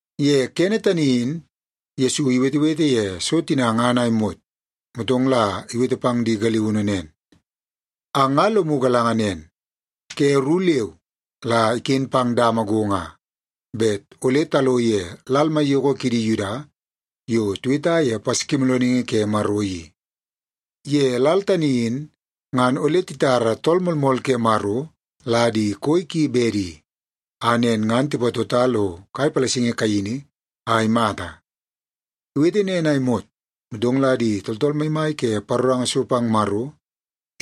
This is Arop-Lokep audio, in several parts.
Ye kene tani in Yesu iwetewete ye so tina ngan a imot, motong la iwete pang di galiunu nen, “Ang nga lomu galanga nen, ke ru leu la iken pang dama go nga, bet ole talo ye lal maiyoko kidi Yuda yo tiweta ye Paskimoolooningi Ke Maro i. Ye lal tani in ngan ole titara Tool Moolmool ke Maro la di koi ki bedi, a nen ngan tipatota lo kai palasingi kaini a imata.” Iwete nen a imot, motong la di tooltool maimai ke paroranga so pang Maro,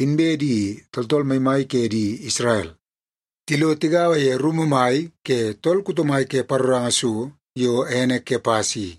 inbe di tooltool maimai ke di Isrel, tilo tigaua ye rumu mai ke tool kuto mai ke paroranga so yo ene Kepas i.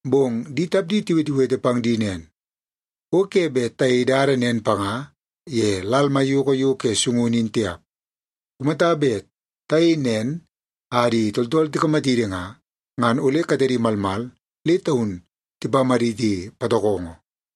Bong di tapdi tiwetewete pang di nen, “O ke bet tayei dada nen panga ye lal maiyoko yo ke sungunu in tiap. Kumata bet tayei nen a di tooltool tikamatidi nga, ngan ole katedi malmal le taun tipamaditi patokongo.”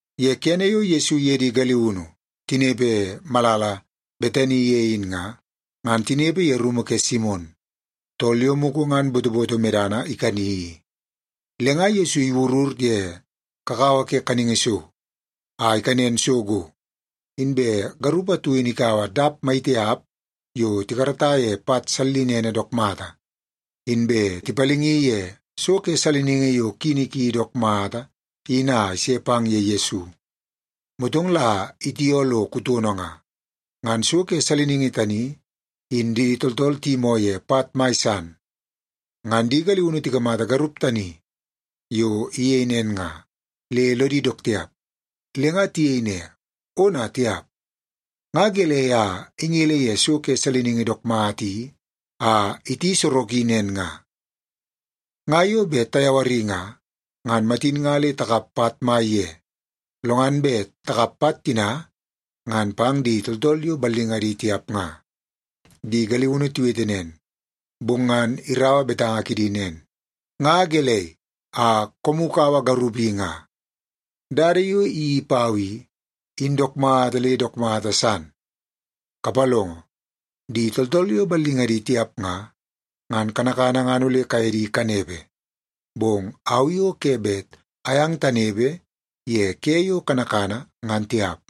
Ye kene yo Yesu iye di galiunu tinepe malala Betani ye in nga, ngan tinepe ye rumu ke Simon, tool yo mugu ngan botoboto medana ikani i. Le nga Yesu iwurur ye kakawa ke kaningi so a ikanen so go, inbe garup atu in ikaua dap maitiap yo tikarata ye pat sallinene dook mata, inbe tipalingi ye so ke saliningi yo kini ki dook mata in a ise pang ye Yesu, motong la itioo lo kutono nga. Ngan so ke saliningi tani, in di tooltool tiyimoo ye pat mai san. Ngan di galiunu tikamata garup tani yo iyei nen nga, le lodi dook tiap. Le nga tiyei ne, “Ona tiap! Nga gelei a ingele ye so ke saliningi dook mata i a iti soroki nen nga? Nga yo bet tayawari nga, ngan matin nga le takap pat mai ye, lo ngan bet takap pat tina ngan pang di tooltool yo ballingadi tiap nga.” Di galiunu tiwete nen, bong ngan iraua betanga kidi nen, “Nga gelei a koomu kaua garup i nga? Dada yo iyeii pau i, in dook mata le dook mata san. Kapalongo, di tooltool yo ballingadi tiap nga, ngan kanakana ngan ole kaye di kanepe, bong au i o ke bet ayang tanepe ye ke yo kanakana, ngan tiap.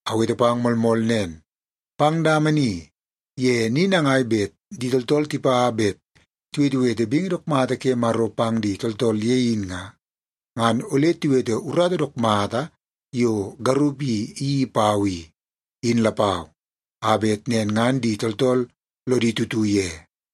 Awete pang moolmool nen, pang dama ni ye ni nangai bet di tooltool tipa bet tiwetewete bingi dook mata ke Maro pang di tooltool ye in nga, ngan ole tiwete urata dook mata yo garup i iyeii pau i, in lapau, a bet nen ngan di tooltool lodi tutu ye.”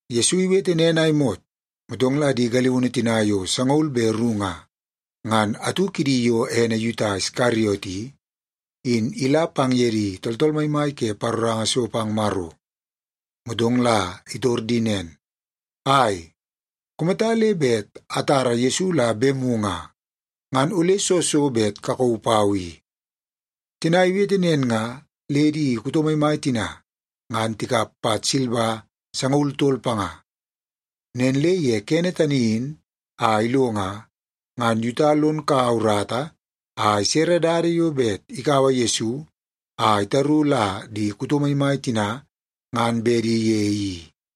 Yesu iwete nen a imot, motong la di galiunu tina yo sangaul be ru nga, ngan atu kidi yo ene Yuta Iskariot i, in ila pang ye di tooltool maimai ke paroranga so pang Maro. Motong la itor di nen, “Ai, kumata le bet atara Yesu la bemu nga, ngan ole soo so bet kakauu pau i?” Tina iwete nen nga, le di kuto maimai tina ngan tikap pat silba sangaul tol panga. Nen le ye kene tani in a ilo nga, ngan Yuta lon kaua urata a isere dada yo bet ikaua Yesu a itaru la di kuto maimai tina ngan bedi ye i.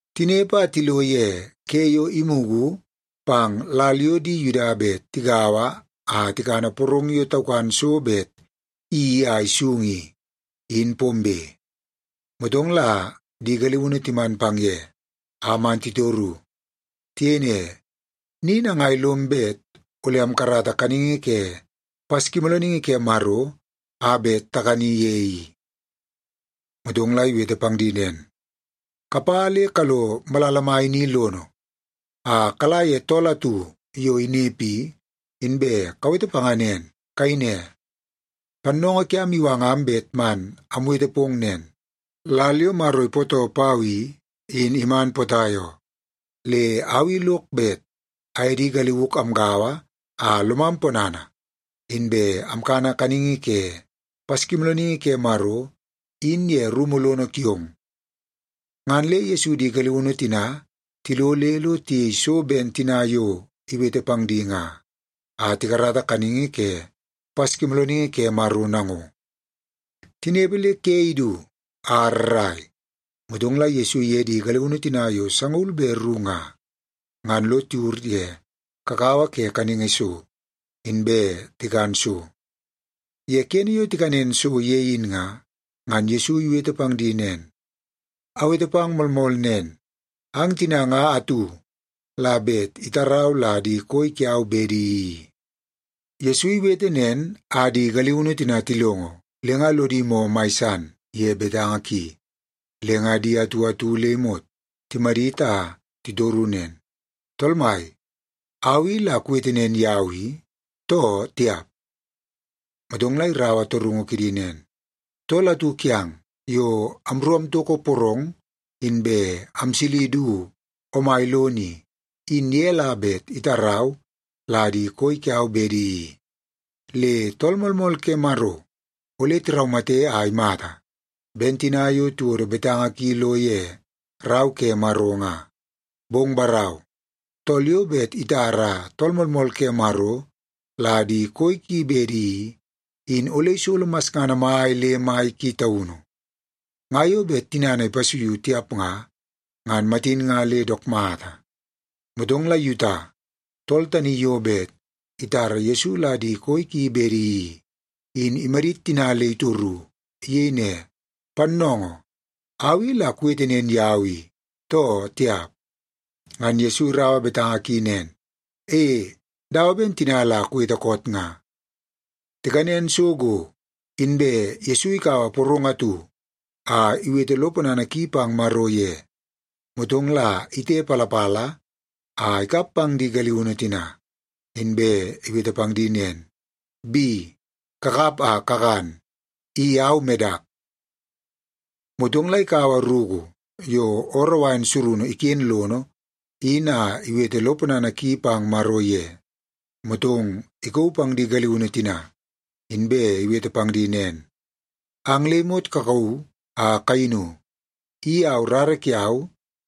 Tinepe a tilo ye ke yo imugu pang lal yo di Yuda bet tigaua a tikana porong yo taukan so bet iyeii a isung i, in pombe. Motong la di galiunu timan pang ye, a man titoru. Tiyei ne, “Ni nangai lom bet ole amkarata kaningi ke Paskimoolooningi ke Maro a bet takani ye i?” Motong la iwete pang di nen, “Kapa le kalo malala mai ni lono, a kala ye tool atu yo inepe i, inbe kawete panga nen. Kayei ne, ‘Pannoongoo kiam iwangam bet man amwete pong nen: Lal yo Maro ipootoo pau i, in iman potai oo. Le au i lok bet aye di galiuk amgaua a lomam ponana, inbe amkana kaningi ke Paskimoolooningi ke Maro in ye rumu lono kiong.’” Ngan le Yesu di galiunu tina tilo le lo tiyei so ben tina yo iwete pang di nga, a tikarata kaningi ke Paskimoolooningi ke Maro nango. Tinepe le ke idu a rrai, motong la Yesu iye di galiunu tina yo sangaul be ru nga, ngan lo tiwur ye kakawa ke kaningi so, inbe tikan so. Ye kene yo tikanen so ye in nga, ngan Yesu iwete pang di nen, “Awete pang moolmool nen, ang tina nga atu la bet itarau la di koi kiau bedi i.” Yesu iwete nen a di galiunu tina tilongo, le nga lodi moo mai san ye betanga ki, le nga di atu atu le imot timadit a titoru nen, “Tool Mai, au i la kuwete nen yau i, too tiap?” Motong la iraua torungu kidi nen, “Tool atu kiang yo amru amtoko porong inbe amsili du omai lono i, in ye la bet itarau la di koi kiau bedi i. Le Tool Moolmool ke Maro ole tiraumate a imata ben tina yo tiwodo betanga ki lo ye Rau ke Maro nga. Bong barau, tool yo bet itara Tool Moolmool ke Maro la di koi ki bedi i, in ole isolo masngana mai le mai ki taunu. Nga yo bet tinana ipasuiu tiap nga, ngan matin nga le dook mata.” Motong la Yuta, tool tani yo bet itara Yesu la di koi ki bedi i, in imadit tina le itoru. Iyei ne, “Pannoongoo, au i la kuwete nen yau i, too tiap?” Ngan Yesu iraua betanga ki nen, “E, dawa ben tina la kuwete koot nga.” Tikanen so go, inbe Yesu ikaua porong atu a iwete lo ponana ki pang Maro ye, motong la itepalapala a ikap pang di galiunu tina, inbe iwete pang di nen, “Bi, kakap a kakan. I au medak.” Motong la ikaua ruku yo ooroo wain surunu iken lono in a iwete lo ponana ki pang Maro ye, motong ikauu pang di galiunu tina, inbe iwete pang di nen, “Ang le imot kakauu a kayinu. I au rara kiau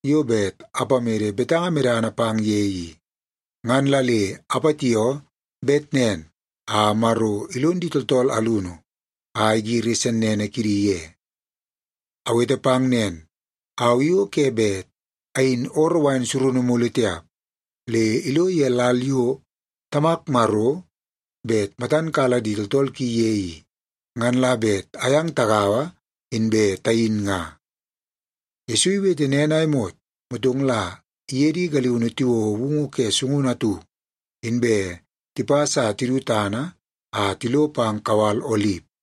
yo bet apamede betanga medana pang ye i. Ngan la le apatioo bet nen a Maro ilon di tooltool alunu a igiri sennene kidi ye. Awete pang nen, au i o ke bet ayin ooroo wain surunu mulu tiap, le ilo ye lal yo Tamak Maro bet matan kala di tooltool ki ye i, ngan la bet ayang tagaua, inbe tayin nga.” Yesu iwete nen a imot, motong la iye di galiunu tiwouo woungu ke sungunu atu, inbe tipas a tidu tana a tilo pang kawal Olip.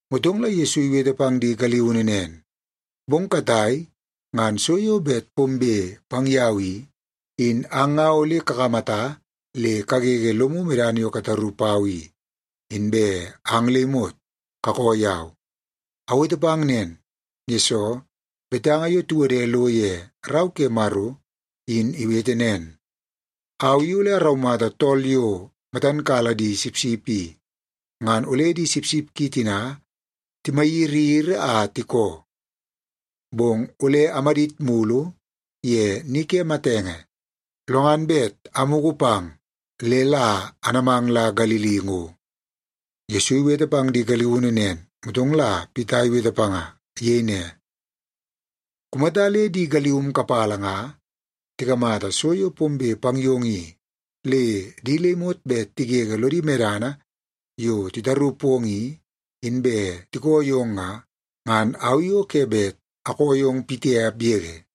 Motong la Yesu iwete pang di galiunu nen, “Bong katai ngan so yo bet pombe pang yau i, in ang nga ole kakamata le kagege lomu medana yo kataru pau i, inbe ang le imot kakoo yau. Awete pang nen, yesoo betanga yo tiwode lo ye Rau ke Maro in iwete nen, ‘Au i ole araumata tool yo matan kala di sipsip i, ngan ole di sipsip ki tina timayiriyiri a tikoo.’ Bong ole amadit mulu ye ni ke matenge, lo ngan bet amugu pang le la anamang la Galili ngo.” Yesu iwete pang di galiunu nen, motong la Pita iwete panga. Iyei ne, “Kumata le di galium kapala nga tikamata so yo pombe pang yong i, le di le imot bet tigege lodi medana yo titaru pong i, inbe tikoo yong nga, ngan au i o ke bet akoo yong pitiap yege.”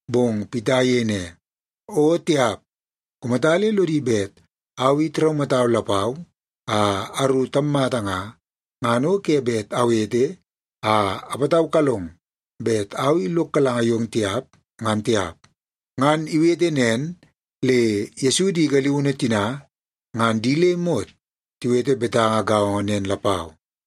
Bong Pita iyei ne, “O tiap! Kumata le lodi bet au i tiraumatau lapau a aru tammata nga, ngan o ke bet awete a apataukalong bet au i lok galanga yong tiap, ngan tiap.” Ngan iwete nen le Yesu di galiunu tina ngan di le imot tiwete betanga gaongo nen lapau.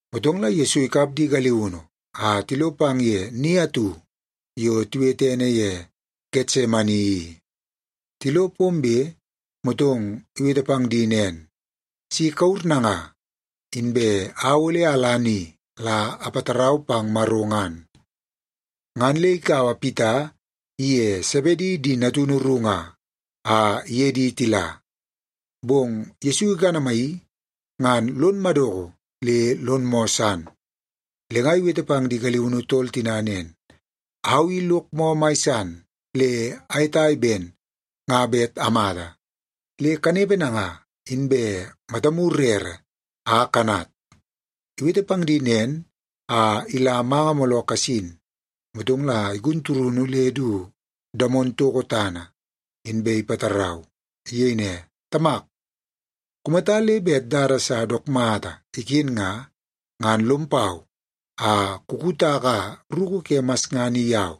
Motong la Yesu ikap di galiunu a tilo pang ye ni atu yo tiwete ene ye Getsemani i. Tilo pombe, motong iwete pang di nen, “Si kawur nanga, inbe au ole ala ni la apatarau pang Maro ngan.” Ngan le ikaua Pita iye Sebedi di natunu ru nga, a iye di tila. Bong Yesu ikanamaii, ngan lon madoko le lon moo san. Le nga iwete pang di galiunu tol tina nen, “Au i lok moo mai san le ayetai ben nga bet amata. Le kanepe nanga, inbe matamu rere a kanat.” Iwete pang di nen a ila manga mooloo kasin, motong la igun turunu le du damon toko tana, inbe ipatarau. Iyei ne, “Tamak, kumata le bet dada sa dook mata iken nga, ngan lom pau a kukutaka ruku ke masngana i yau.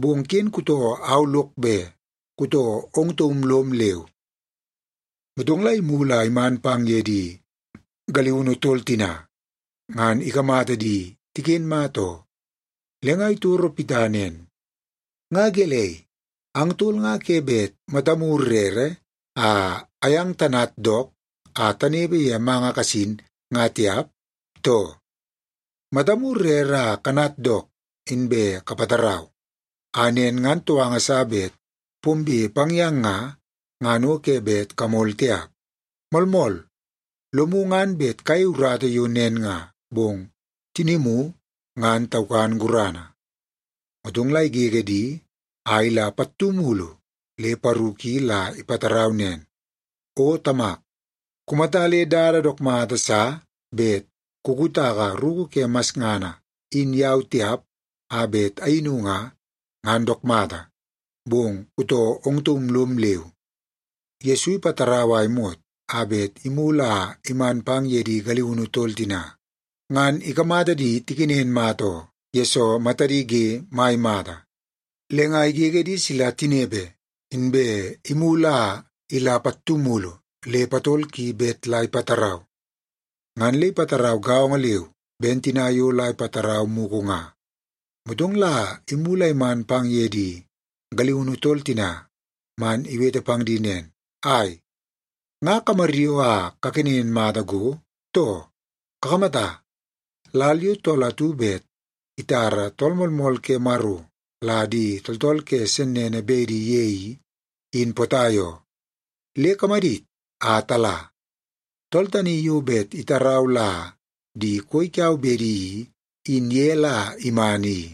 Bong ken kutoo au lok be, kutoo ong taum lom leu.” Motong la imulu a iman pang ye di galiunu tol tina, ngan ikamata di tiken mata oo. Le nga itoro Pita nen, “Nga gelei, ang tol nga ke bet matamu rere a ayang tanat dook a tanepe ye manga kasin nga tiap, too? Matamu rere a kanat dook inbe kapatarau, a nen ngan touanga sa bet pombe pang yang nga, ngan o ke bet kamol tiap. Moolmool, lomu ngan bet kayei urata yo nen nga, bong tinimu ngan taukan gurana.” Motong la igege di a ila pattu mulu le paru ki la ipatarau nen, “O Tamak, kumata le dada dook mata sa bet kukutaka ruku ke masngana in yau tiap a bet ayinu nga, ngan dook mata. Bong kutoo ong taum lom leu.” Yesu ipatarau a imot a bet imulu a iman pang ye di galiunu tol tina, ngan ikamata di tikenen mata oo, yesoo matadi ge mai mata. Le nga igege di sila tinepe, inbe imulu a ila pattu mulu le patol ki bet la ipatarau. Ngan le ipatarau gaongo leu ben tina yo la ipatarau mugu nga. Motong la imulu a iman pang ye di galiunu tol tina man iwete pang di nen, “Ai, nga kamaryoo a kakenen mata go, too? Kakamata, lal yo tool atu bet itara Tool Moolmool ke Maro la di tooltool ke sennene bedi ye i, in potai oo. Le kamadit a tala! Tool tani yo bet itarau la di koi kiau bedi i, in ye la iman i.”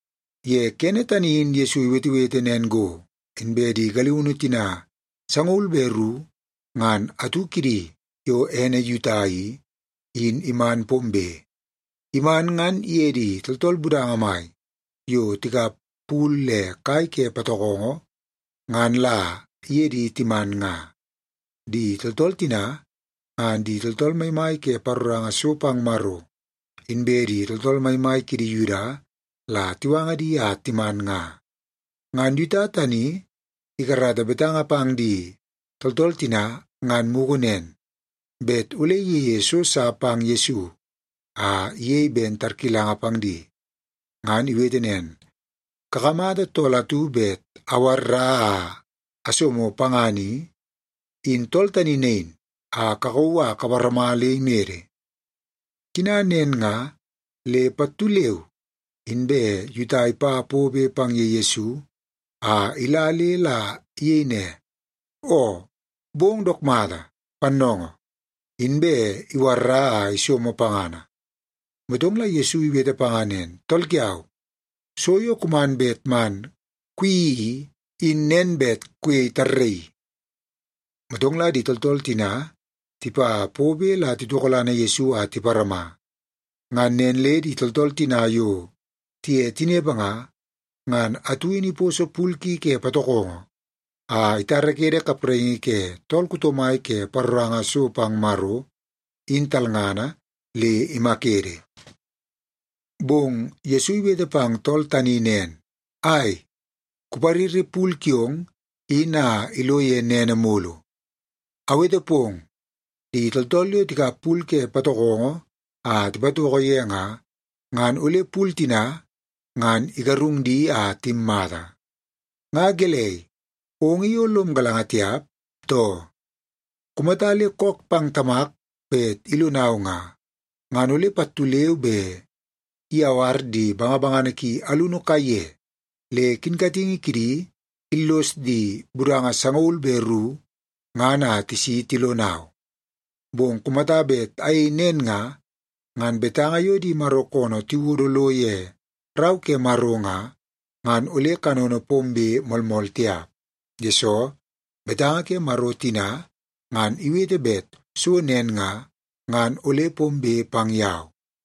Ye kene tani in Yesu iwetewete nen go, inbe di galiunu tina sangaul be ru ngan atu kidi yo ene Yuta i, in iman pombe. Iman ngan iye di tooltool budanga mai yo tikap pul le kai ke patokongo ngan la iye di timan nga. Di tooltool tina, ngan di tooltool maimai ke paroranga so pang Maro inbe di tooltool maimai kidi Yuda la tiwanga di a timan nga. Ngan Yuta tani ikarata betanga pang di tooltool tina ngan mugu nen, bet ole iyeie so sa pang Yesu a iyei ben tarkilanga pang di. Ngan iwete nen, “Kakamata tool atu bet awarra a asomo pangana i, in tool tani nain, a kakauu a kaparama le imede.” Tina nen nga, le pattu leu inbe Yuta ipa pobe pang ye Yesu a ila le la iyei ne, “O bong dook mata, Pannoongoo!” Inbe iwarra a isomo pangana. Motong la Yesu iwete panga nen, “Tool kiau, so yo kuman bet man kuyeii i, in nen bet kuyei tarraii.” Motong la di tooltool tina tipa pobe la titokolana Yesu a tiparama. Ngan nen le di tooltool tina yo tiye tinepe nga, ngan atu in iposo pul ki ke patokongo a itarakede kapraingi ke tool kuto mai ke paroranga so pang Maro, in talngana, le imakede. Bong Yesu iwete pang tool tani nen, “Ai, kupariri pul kiong in a ilo ye nene mulu. Awete pong, di tooltool yo tikap pul ke patokongo a tipatoko ye nga, ngan ole pul tina ngan igarung di a timmata. Nga gelei, ong i o lom galanga tiap, too? Kumata le kook pang Tamak bet ilonau nga, ngan ole pattu leu be iyawar di bangabangana ki alunu kaiye le kinkatingi kidi illos di budanga sangaul be ru ngan a tisi tilonau. Bong kumata bet ayei nen nga, ngan betanga yo di Maro koonoo tiwodo lo ye Rau ke Maro nga, ngan ole kanono pombe moolmool tiap. Yesoo, betanga ke Maro tina ngan iwete bet so nen nga, ngan ole pombe pang yau.”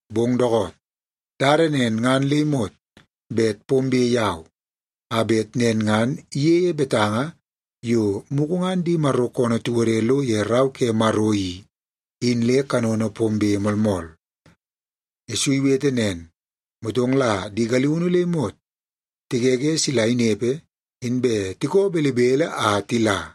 Bong dookoot, dada nen ngan le imot bet pombe yau, a bet nen ngan iyeie betanga yo mugu ngan di Maro koonoo tiwode lo ye Rau ke Maro i, in le kanono pombe moolmool.” Yesu iwete nen, motong la di galiunu le imot tigege sila inepe, inbe tikoo belebele a tila.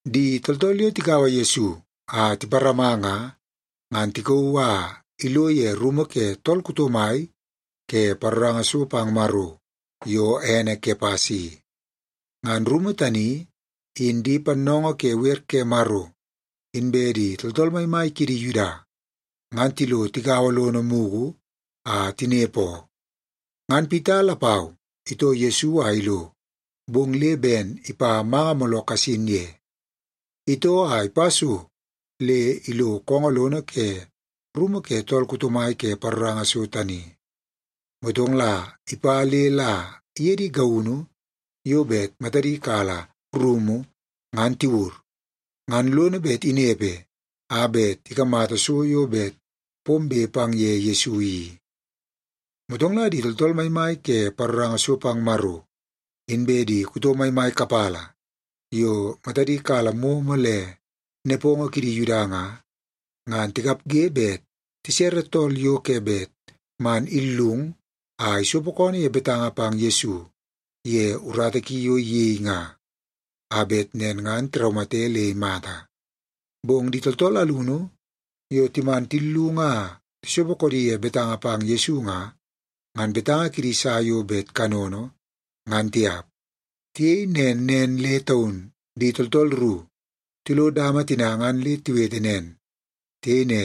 Di tooltool yo tikaua Yesu a tiparama nga, ngan tikauu a ilo ye rumu ke tool kuto mai ke paroranga so pang Maro yo ene Kepas i. Ngan rumu tani, in di pannoongoo ke wer ke Maro inbe di tooltool maimai kidi Yuda, ngan tilo tigaua lono mugu a tinepe oo. Ngan Pita lapau itoo Yesu a ilo, bong le ben ipa manga mooloo kasin ye. Itoo a ipa so le ilo koongoo lono ke rumu ke tool kuto mai ke paroranga so tani, motong la ipa le la iye di gaunu yo bet matadi kala rumu ngan tiwur, ngan lono bet inepe a bet ikamata so yo bet pombe pang ye Yesu i. Motong la di tooltool maimai ke paroranga so pang Maro, inbe di kuto maimai kapala yo matadi kala momo le nepongo kidi Yuda nga, ngan tikapge bet tisere tool yo ke bet man illung a isopo koonoo ye betanga pang Yesu ye urata ki yo iyei nga, a bet nen ngan tiraumate le imata. Bong di tooltool alunu yo timan tillung a tisopo koodi ye betanga pang Yesu nga, ngan betanga kidi sa yo bet kanono, ngan tiap. Tiyei nen nen le taun di tooltool ru tilo dama tina ngan le tiwete nen. Tiyei ne,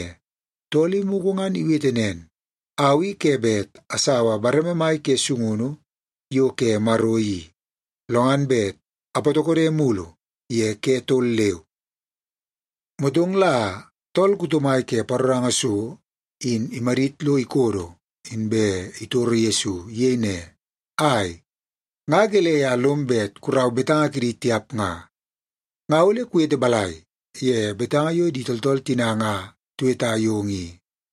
“Tool i mugu ngan iwete nen, ‘Au i ke bet asaua bareme mai ke sungunu yo ke Maro i, lo ngan bet apatokode mulu ye ke tol leu.’” Motong la tool kuto mai ke paroranga so in imadit lo ikodo, inbe itoro Yesu. Iyei ne, “Ai, nga gelei a lom bet kurau betanga kidi tiap nga? Nga ole kuwete balai ye betanga yo di tooltool tina nga tiweta yong i?”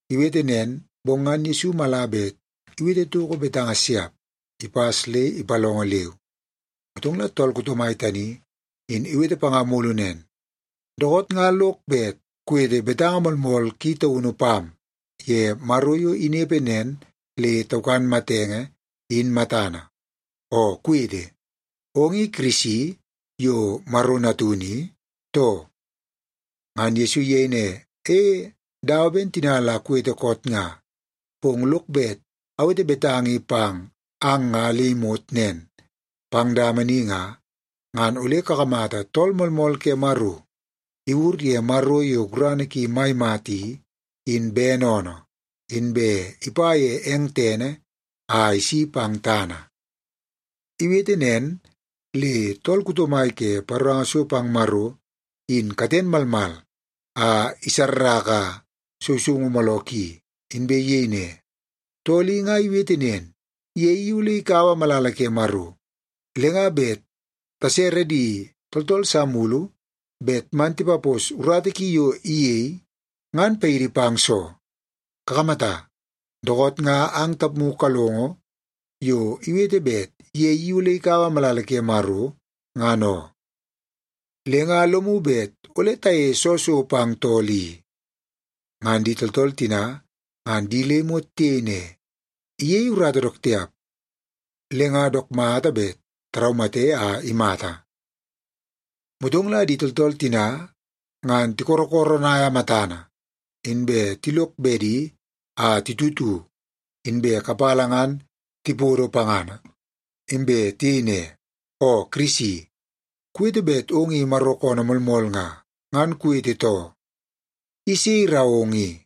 Iwete nen, bong ngan Yesu mala bet iwete toko betanga siap, ipas le ipalongo leu. Motong la tool kuto mai tani in iwete panga mulu nen, “Dookoot nga lok bet kuwete betanga moolmool ki taunu pam ye Maro yo inepe nen le taukan matenge, in matana. Oo kuwete, ong i Kirisi yo Maro Natunu i, too?” Ngan Yesu iyei ne, “E, dawa ben tina la kuwete koot nga. Bong lok bet awete betanga i pang ang nga le imot nen. Pang dama ni nga, ngan ole kakamata Tool Moolmool ke Maro iwur ye Maro yo gurana ki mai mata i, in bene oonoo, inbe ipa ye eng tene a isi pang tana.” Iwete nen, le tool kuto mai ke paroranga so pang Maro in katen malmal a isarraka sousoungu mooloo ki, inbe iyei ne, “Tool i nga iwete nen, ye i ole ikaua malala ke Maro, le nga bet tasere di tooltool sa mulu bet man tipapos urata ki yo iyei, ngan paidi pang soo? Kakamata, dookoot nga ang tapmu kalongo yo iwete bet ye i ole ikaua malala ke Maro, ngan oo. Le nga lomu bet ole tayeie soo so pang tool i?” Ngan di tooltool tina ngan di le imot tiyei ne, “Iyei urata dook tiap, le nga dook mata bet taraumate a imata.” Motong la di tooltool tina ngan tikorokoronaia matana, inbe tilok bedi a titutu, inbe kapala ngan tipodo pangana, inbe tiyei ne, “Oo Kirisi, kuwete bet ong i Maro koonoo moolmool nga, ngan kuwete too. I sei irau ong i?”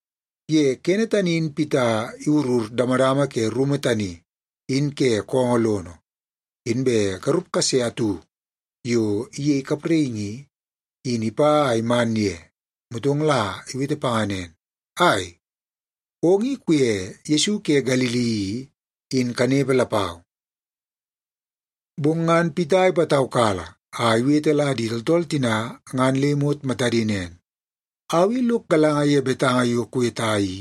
Ye kene tani in Pita iwurur damadama ke rumu tani in ke koongoo lono, inbe garup kase atu yo iyei kapraingi i, in ipa a iman ye. Motong la iwete panga nen, “Ai, ong i kuye Yesu ke Galili i, in kanepe lapau.” Bong ngan Pita ipataukala a iwete la di tooltool tina ngan le imot matadi nen, “Au i lok galanga ye betanga yo kuweta i,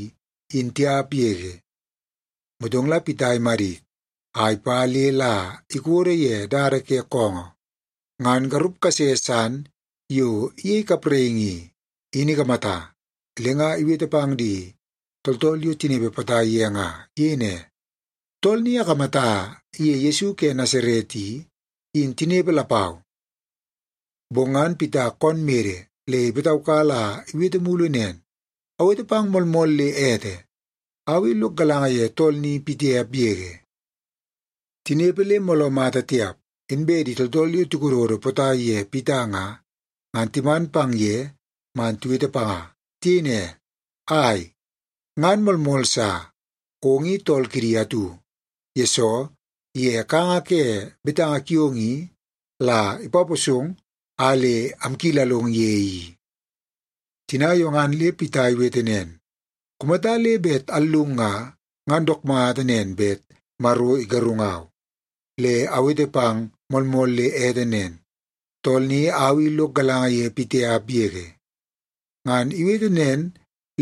in tiap yege.” Motong la Pita imadit a ipa le la ikodo ye dada ke koongoo, ngan garup kase san yo iyei kapraingi i, in ikamata. Le nga iwete pang di tooltool yo tinepe potai ye nga. Iyei ne, “Tool ni akamata iye Yesu ke Nasaret i, in tinepe lapau.” Bong ngan Pita koon mede le ipataukala a iwete mulu nen, “Awete pang moolmool le ete, au i lok galanga ye tool ni pitiap yege!” Tinepe le mooloo mata tiap, inbe di tooltool yo tikododo potai ye Pita nga, ngan timan pang ye man tiwete panga. Tiyei ne, “Ai, ngan moolmool sa! Ong i tool kidi atu, yesoo ye kanga ke betanga kiong i la ipaposong a le amkilalong ye i.” Tina yo ngan le Pita iwete nen, “Kumata le bet allung nga, ngan dook mata nen bet Maro igarungau. Le awete pang moolmool le ete nen, tool ni au i lok galanga ye pitiap yege!” Ngan iwete nen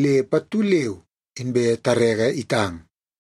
le pattu leu inbe tareke itang.